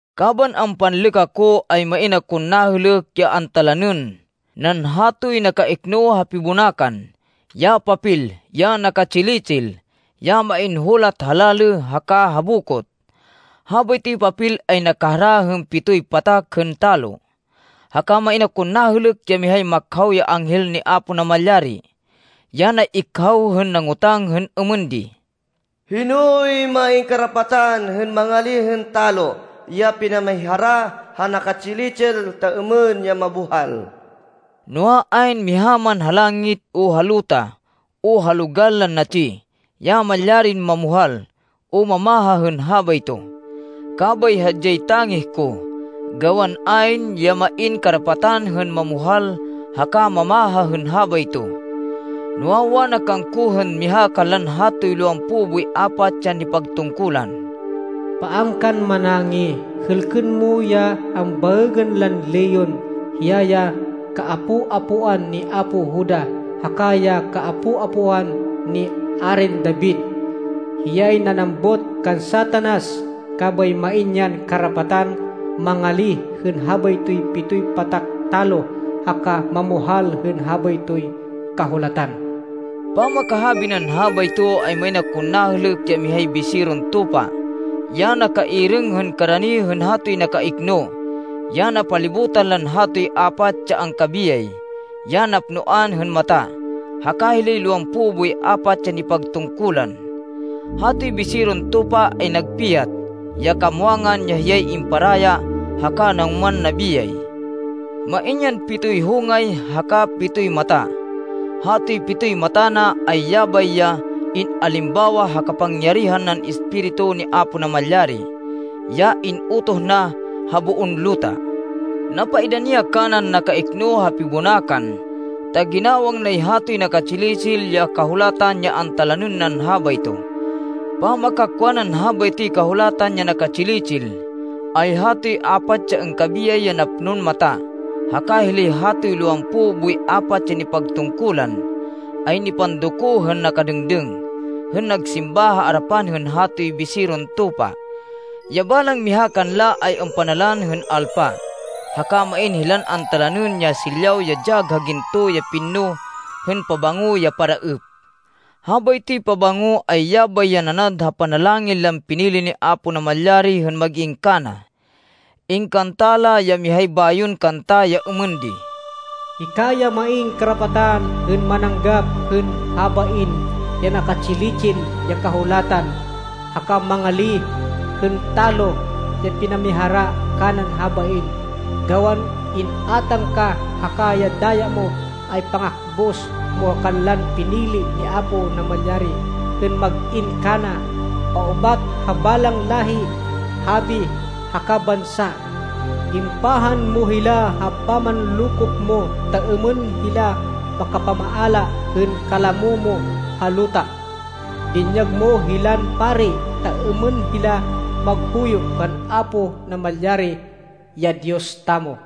Kaban ampanlêk ako, ay main akon nahêlêk, ya antalanên nan hatoy nakaikno ha pibonakan, ya papel, ya naka-tsili-tsil, ya main hulat ha lalê haka ha bokot. Habaytoy papel ay nakahara hên pitoy patak hên talo. Haka main akon nahêlêk ya mihay makhaw ya anghel ni Apo Namalyari, ya nay-ikhaw hên nangotang hên êmên di: “Hinoy main karapatan hên mangalíh hên talo ya pinamihara ha naka-tsili-tsil, ta êmên ya mabuhal?” Noa, ayn miha man ha langit, o ha luta, o ha logal lan natsi, ya malyarin mamuhal o mamaha hên habayto. Kabay hadyay tangih ko gawan ayn ya main karapatan hên mamuhal haka mamaha hên habayto. Noa, wana kangko hên miha kanlan hatoy lowampo boy apat ya nipagtungkulan, “Paan kan manangih! Hêlkên mo ya ambaêgên lan Leon. Hiya ya kaapo-apoan ni apo Juda haka ya kaapo-apoan ni Arin David. Hiyay nanambut kan Satanas, kabay main yan karapatan mangalíh hên habaytoy pitoy patak talo haka mamuhal hên habaytoy kahulatan.” Pamakahabi nan habayto, ay main akon nahêlêk ya mihay Biseron Tupa, ya nakairêng hên karani hên hatoy nakaikno ya napalibutan lan hatoy apat ya angkabiyay, ya napnoan hên mata, haka hilay lowampo boy apat ya nipagtungkulan. Hatoy Biseron Tupa ay nagpiyat, ya kamwangan ya hiyay imparaya haka nangoman nabiyay. Main yan pitoy hongay haka pitoy mata. Hatoy pitoy mata na, ay yabay ya in-alimbawa ha kapangyarihan nan Espiritu ni Apo Namalyari, ya in-utoh na ha boon luta. Napaidani ya kanan nakaikno ha pibonakan, ta ginawang nay hatoy naka-tsili-tsil ya kahulatan ya antalanên nan habayto. Pamakakwa nan habaytoy kahulatan ya naka-tsili-tsil, ay hatoy apat ya angkabiyay ya napnon mata, haka hilay hatoy lowampo boy apat ya nipagtungkulan, ay nipandoko hên nakadêngdêng hên nagsimba ha arapan hên hatoy Biseron Tupa. Ya balang miha kanla ay ampanalan hên alpa, haka main hilan antalanên ya silyaw ya dyag ha ginto ya pinno hên pabango ya paraêp. Habaytoy pabango, ay yabay ya nanad ha panalangin lan pinili ni Apo Namalyari hên mag-in kana. Ingkanta la ya mihay bayon kanta, ya êmên di: “Hika ya main karapatan hên mananggap hên habain ya naka-tsili-tsil ya kahulatan, haka mangalíh hên talo ya pinamihara kanan habain, gawan in-átang ka, haka ya daya mo, ay pangakbus mo kanlan pinili ni Apo Namalyari hên mag-in kana, paubat ha balang láhi, habi, haka bansa. Impahan mo hila ha pamanlokop mo ta êmên hila makapamaala hên kalamo mo ha luta. Dinyag mo hilan pari ta êmên hila maghuyo kan Apo Namalyari ya Diyos tamo.”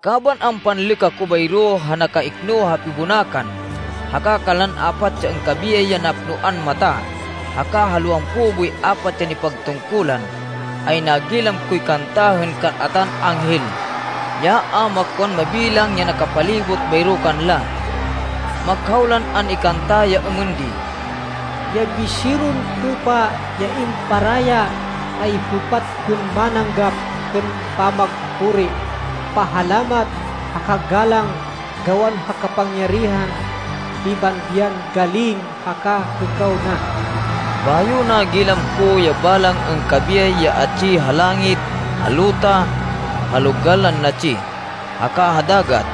Kaban ampanlêk ako bayro ha nakaikno ha pibonakan haka kanlan apat ya angkabiyay ya napnoan mata, haka ha lowampo boy apat ya nipagtungkulan, ay nagilam koy kanta hên kal-atan anghel, ya a makwan mabilang ya nakapalibot bayro kanla. Makhaw lan an-ikanta ya êmên di: “Ya Biseron Tupa ya imparaya ay hêpat hên mananggap hên pamagpuri, pahalamat haka galang, gawan ha kapangyarihan, pibandian, galing, haka hêkaw na!” Bayo nagilam ko ya balang angkabiyay ya atsi ha langit, ha luta, ha logal lan natsi, haka ha dagat.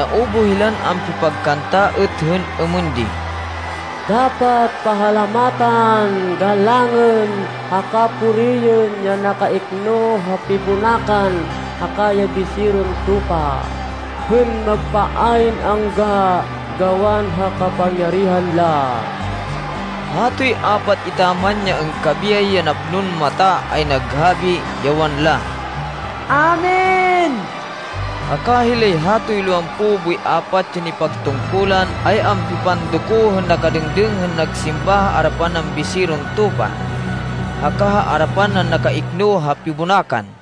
Naubuh hilan ampipagkanta êt hên êmên di: “Dapat pahalamatan, galangên, haka puriên ya nakaikno ha pibonakan haka ya Biseron Tupa, hên magpa ayn angga gawan ha kapangyarihan la!” Hatoy apat etaman ya angkabiyay ya napnon mata ay naghabi, ya wanla, “Amen!” Haka hilay hatoy lowampo boy apat ya nipagtungkulan ay ampipandoko hên nakadêngdêng hên nagsimba ha arapan nan Biseron Tupa haka ha arapan nan nakaikno ha pibonakan.